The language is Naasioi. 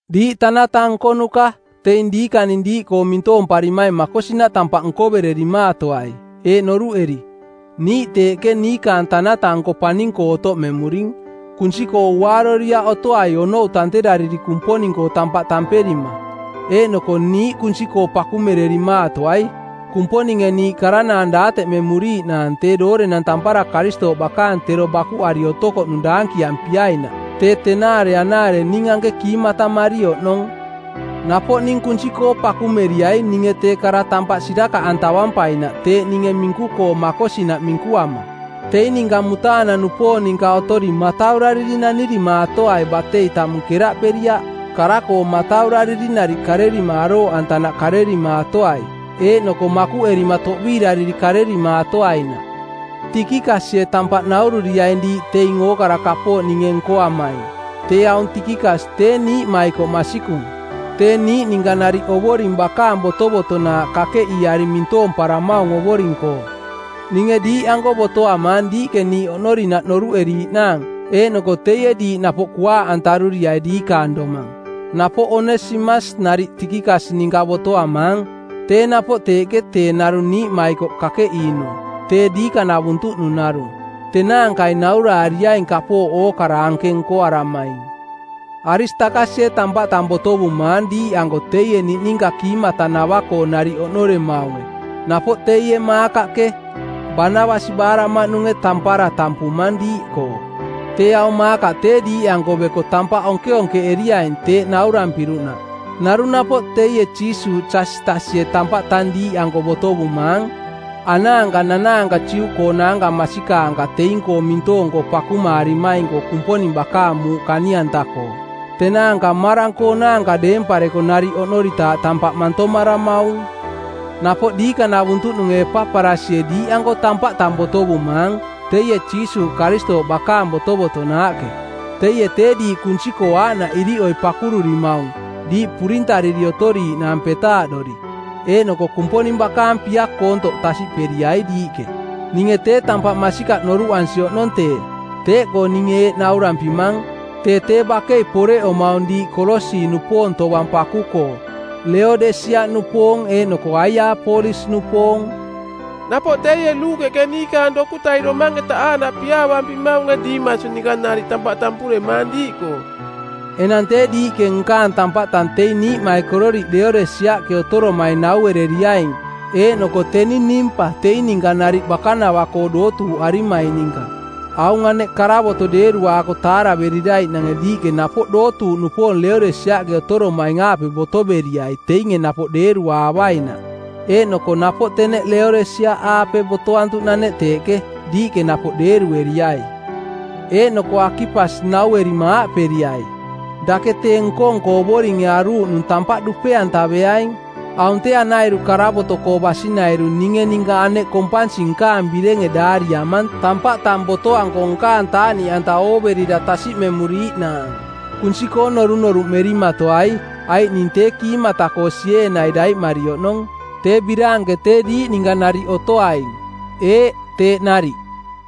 Diiꞌ tanata nkonuka, teing diikaning diiꞌkoo mintoomparimaing makosinaꞌ tampaꞌ nkovererimaatoai, eeꞌ noruꞌeri, “Niiꞌ teeꞌke niikaang Tanata-nko paning-koo otoꞌmemuring.” Kunsi-koo uaaroriaꞌ otoai onou tanterariri Kumponing-koo tampaꞌ tamperima. Eeꞌnoko niiꞌ kunsi-koo pakumererimaatoai, Kumponinge niiꞌ karanaang daateꞌmemuriiꞌnaang tee doorenang tampara Karistooꞌ bakaang tero bakuꞌari otokoꞌnung daankiampiainaꞌ, tee tenaare aaꞌnaare ning anke kiimatamari oꞌnong. Napoꞌ ning kunsi-koo pakumeriai ninge tee kara tampaꞌ sirakaꞌantavampainaꞌ teeꞌ ninge minku-koo makosinaꞌ minkuama. Teing ninka mutaanang-nupoong ninka otori mataurariri nanirimaatoai batei tamung keraꞌperiaꞌ. Kara-koo mataurariri nariꞌ karerima arooꞌantanaꞌ karerimaatoai, eeꞌnoko makuꞌerima toꞌbiirariri karerimaatoainaꞌ. Tikikasie tampaꞌ naururiaing diiꞌ teing ookara kapooꞌ ninge nkoamaing. Tee aung Tikikas tee niiꞌmaikoꞌ masikung, tee niiꞌ ninka nariꞌ Ovoring bakaang botovotonaaꞌ kakeꞌiiari mintoomparamaung Ovoring-koo. Ninge diiꞌanko botoamaang diiꞌke niiꞌ oꞌnorinaꞌ noruꞌeriiꞌnaang eeꞌnoko teie diiꞌ napoꞌ kuaaꞌantaruriai diikaang domang. Napoꞌ Onesimas nariꞌ Tikikas ninka botoamaang, tee napoꞌ teeꞌke tee narung niiꞌmaikoꞌ kakeꞌiinung, tee diikanavuntuꞌnung narung. Tenaankai nauraariaing kapooꞌ ookara anke nkoaramaing. Aristakasie tampaꞌ tang botovumaang diiꞌanko teie niꞌninka kiimatanava-koo nariꞌ oꞌnoremaunge, napoꞌ teie Maakaꞌke, Baanabas baaraꞌmaꞌnunge, tampara tampumang diiꞌkoo. Tee aung Maakaꞌ tee diiꞌanko beko tee tampaꞌ onkeonkeꞌeriaing teeꞌ naurampiruꞌnaꞌ. Narung napoꞌ teie Jiisuuꞌ Jasitasie tampaꞌ tang diiꞌanko botovumaang. Anaanka nanaanka Juꞌkoonaanka masikaanka teing-koo mintoong-koo pakumaarimaing-koo Kumponing bakaang muuꞌ kani-anta-koo. Tenaanka mmarang-koonaanka deempareko nariꞌ oꞌnoritaaꞌ tampaꞌ mantomaramaung. Napoꞌ diikanavuntuꞌnunge Epaparasie diiꞌanko tampaꞌ tang botovumaang, teie Jiisuuꞌ Karistooꞌ bakaang botovotonaaꞌke. Teie tee diiꞌ kunsi-koo aaꞌnaꞌ iriꞌoi pakururimaung, diiꞌ purintariri otoriiꞌnaang petaaꞌdori, eeꞌnoko Kumponing bakaang pia koontoꞌ tasiꞌperiai diiꞌke. Ninge tee tampaꞌ masikaꞌ noruꞌansi oꞌnong tee, teeꞌkoo ninge eeꞌ naurampimang: Tee tee bakei poreꞌomaung diiꞌ Kolosi-nupoong tovang paku-koo, Leodesiaꞌnupoong eeꞌnoko Aiaapolis-nupoong. Napoꞌ teie Luukeꞌke niikaang dokutai domang-eta aaꞌnaꞌ piaavampimaunge Dimas ninka nariꞌ tampaꞌ tampuremaang diiꞌkoo. Enang tee diiꞌke nkaang tampaꞌ tang teing niiꞌmaikororiꞌ Leodesiaꞌke otoromaing nauereriaing eeꞌnoko teni Nimpa teing ninka nariꞌ bakanava-koo dootuuꞌarimaing ninka. Aung aneꞌ karavoto deeruaako taareveriraiꞌnange diiꞌke napoꞌ dootuuꞌnupoong Leodesiaꞌke otoromaing-aape botoveriai teinge napoꞌ deeruaavainaꞌ, eeꞌnoko napoꞌ teneꞌ Leodesiaꞌaape botoantuꞌnaneꞌ teeꞌke, diiꞌke napoꞌ deerueriai. Eeꞌnoko Akipas nauerima aaꞌperiai, “Dake tee nko-nko Ovoringe aruuꞌnung tampaꞌ dupe-antaveaing.” Aung tee anairu karavoto-koo basinairu ninge ninka aneꞌ kompansi nkaang birenge daariamang tampaꞌ tang botoanko nkaang taaꞌniꞌanta ooverira tasiꞌmemuriiꞌnaang. Kunsi-koo norunoruꞌmerimatoai, aiꞌ ning tee kiimata-koo sieenai daiꞌmari oꞌnong. Tee biraanke tee diiꞌ ninka nariꞌ otoaing. Eeꞌ, teeꞌ nariꞌ.